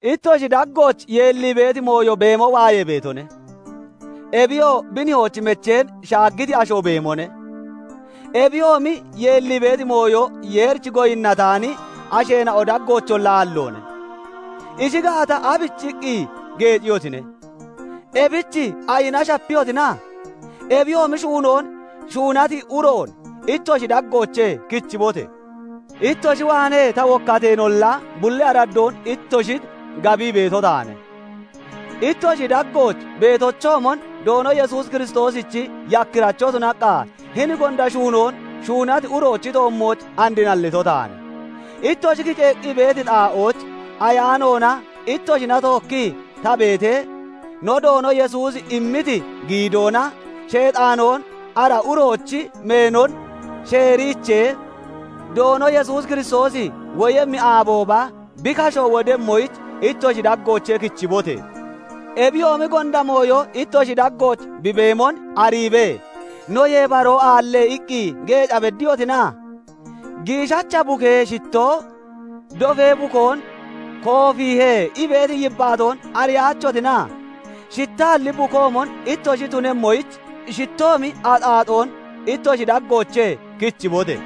Ittoshi daggooch yeellii beeti mooyo beemo waayee beetone; ebiyoo bi nihoochi mecheen shaaggiti asho beemone. Ebiyoomi yeellii beeti mooyo Yeerich goyinnataani asheena'o daggoocholla aalloone. Ishi gaata, aabichiqqi geeciyotine? Ebich ayina shapiyotina? Ebiyoomi shuunoon shuunati uroon ittoshi daggoochee kichibote! Ittoshi waanee ta wokkateenolla, bulli araddoon ittoshin gabii beeto taane; ittoshi daggooch beetochoomon Doono Yesuus Kiristoosichi yakkiracho tunaqqa, hini gonda shuunoon shuunati uroochi toommooch and nallito taane. Ittoshi kiceeqqi beeti xaa'ooch ayaanoona ittoshina tookkii ta beetee, no Doono Yesuusi immiti giidoona, Sheexaanoo ara uroochi meenon sheeriichee, Doono Yesuus Kiristoosi woyemmi aabooba bi kasho wodemmoyich, ittoshi daggoochee kichibote! Ebiyoomi gonda mooyo ittoshi daggooch bi beemon ariibee, "Noyee baroo aalle" iqqi geeca beddiyotina? "Giishacha bukee shittoo dofee bukoon koofiihe" ii beeti yibbaatoon ariyaachotina? Shittaalli bukoomon ittoshi tunemmoyich, shittoomi axaaxoon ittoshi daggoochee kichibote!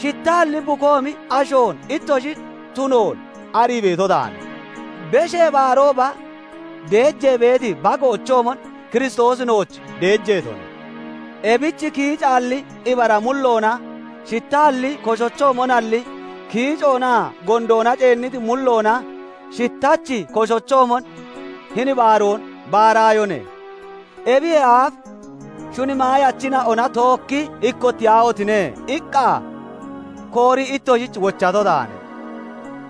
Shittaalli bukoomi asho ittoshi tunoon arii beeto taane. Beshee Baarooba, deejee beeti bagoochoomon, Kiristoosi nooch deejeetone. Ebich kiicaalli ibara mulloona shittaalli koshochoomonalli, kiicoonaa gondoona ceenniti mulloona shittachi bukoochoomon hini baaroon baaraayone. Ebiyee aaf "Shuni maayachina'ona tookki ikkottiyaahotine!" iqqa koorii ittoshich wochato taane.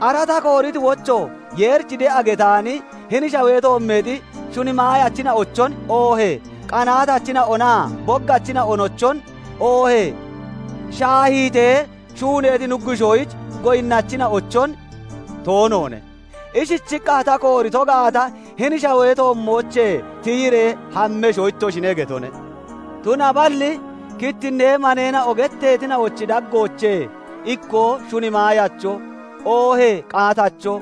Ara ta kooriti wocho, Yeerich de'a getaani hini shawee toommeexi shuni maayachina'ochon, oohee qaatachina'onaa boggachina'onochon, oohee shaahiitee shuuneeti nuggushoyich goyinnachina'ochon toonoone. Ishichiqqa ta koorito gaata, hini shawee toommoochee tiyiree hammesho ittoshine getone. Tunaballi "Kittinnee maneena'o getteetina'ochi daggoochee ikkoo shuni maayacho, oohee qaatacho,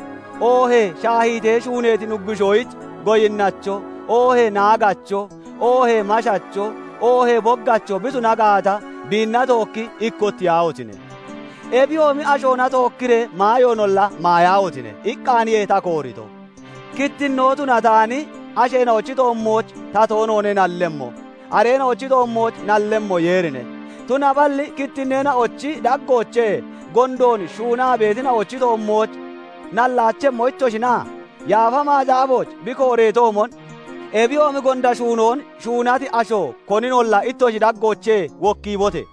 oohee shaahiitee shuuneeti nuggushoyich goyinnacho, oohee naagacho, oohee mashacho, oohee boggacho bi tuna gaata, biinna tookki ikkottiyaahotine! Ebiyoomi ashoona tookkiree maayoonolla maayaahotine!" iqqaaniye ta koorito. Kittinnoo tunataani asheena'ochi toommooch ta toonoone nallemmo; areena'ochi toommooch nallemmo Yeerine. Tunaballi kittineena'ochi daggoochee gondoon shuunaa beetina'ochi toommooch nallaachemmo ittoshina? Yaafa Macaafooch bi kooreetoomon, "Ebiyoomi gonda shuunoon shuunati asho koninolla ittoshi daggoochee wokkiibote!"